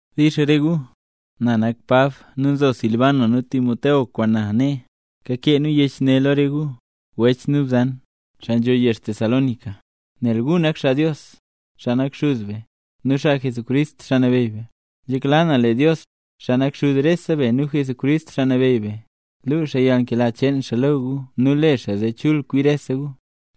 Dix re gu. Na nak Pab, nu nzo Silban nu Timoteo kwaan na nee. Kakee nu yech ne lo re gu, wech nu bzan, xaa nzho yezh Tesalónica, nel gu nak xaa Dios, xaa nak Xuz be, nu xaa Jesucrist, Xaa Nabeyy be. Nzhekla na lee Dios, xaa nak Xuz rese be nu Jesucrist, Xaa Nabeyy be, luu xaa yalnkela cheen xaa lo gu nu le xaa zee kwi chul rese gu.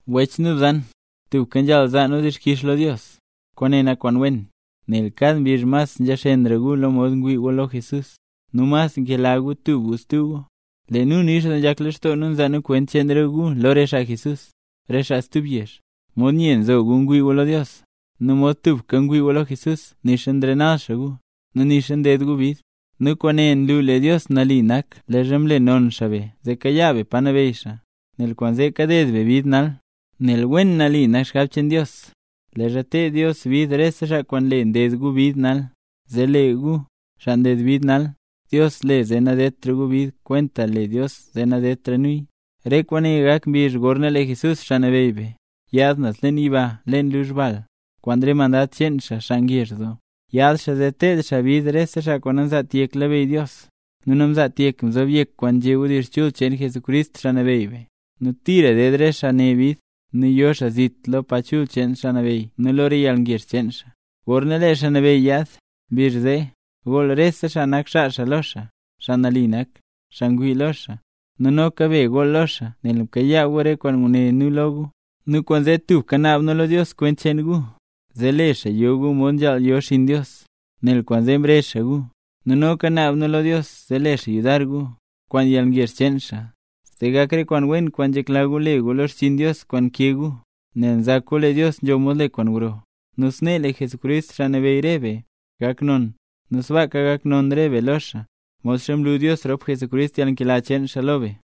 Wech nu bzan, tubka nzhaal zaa nu dixkix lo Dios, kwaane nak kwaan wen, nel kad mbizh mas nzhaxenra gu lo mod ngwii gu lo Jesús, nu mas nkela gu tub gu stub gu. Lee nu nix doo nzhak lextoo nu nzaa nu kwent cheen re gu lo re xaa Jesús, re xaa stub yezh, mod nye nzo gu lo Dios, nu mod tubka ngwii gu lo Jesús nixa nrenal xaa gu, nu nixa nded gu bid. Nu kwaane nlu lee Dios nali nak leezha mle non xaa be zee kayaa be pa nabeyy xaa, nel kwaanzee kaded be bid nal. Nel wen nali nak xgab cheen Dios, leezha ted Dios bid rese xaa kwaan nle nded gu bid nal; zee lee gu, xaa nded bid nal, Dios le zee nadedtra gu bid kwentaxa le Dios zee nadedtra nuya. Re kwaane gak mbizh gorna lee Jesús, Xaa Nabeyy be, yaad naz leen yiba leen luzh bal, kwaan re mandad cheen xaa, xaa ngezh doo. Yaad xaa zee teed xaa bid re xaa nanzaat yek labeyy Dios, nu namzaat yek mzob yek kwaan nzhé wdizh chul cheen Jesucrist, Xaa Nabeyy be. Nu tira ded re xaa ne bid, nu yo xaa zit lo pa chul cheen Xaa Nabeyy nu lo re yalngezh cheen xaa. Gorna lee Xaa Nabeyy yaad mbizh zee, gool rese xaa nak xaa xaa lo xaa, xaa nambey nak, xaa ngwii lo xaa. Nu noka be gool lo xaa nel mkayaa gu re kwaan nguné nu lo gu. Nu kwaanzee tubka naab nu lo Dios kwent cheen gu, zee le xaa yo gu mod nzhaal yo xinn Dios, nel kwaanzee mrezh xaa gu. Nu noka naab nu lo Dios zee le xaa yudar gu, kwaan yalngezh cheen xaa, zee gak re kwaan wen kwaan nzhekla gu le gu lo xchiin Dios kwaan nkee gu, nel nzak gu lee Dios nzho mod le kwaan gro. Nu snee lee Jesucrist, Xaa Nabeyy re be, gak non, nu sbaaka gak non re be lo xaa, modxa mlu Dios rop Jesucrist yalnkela cheen xaa lo be.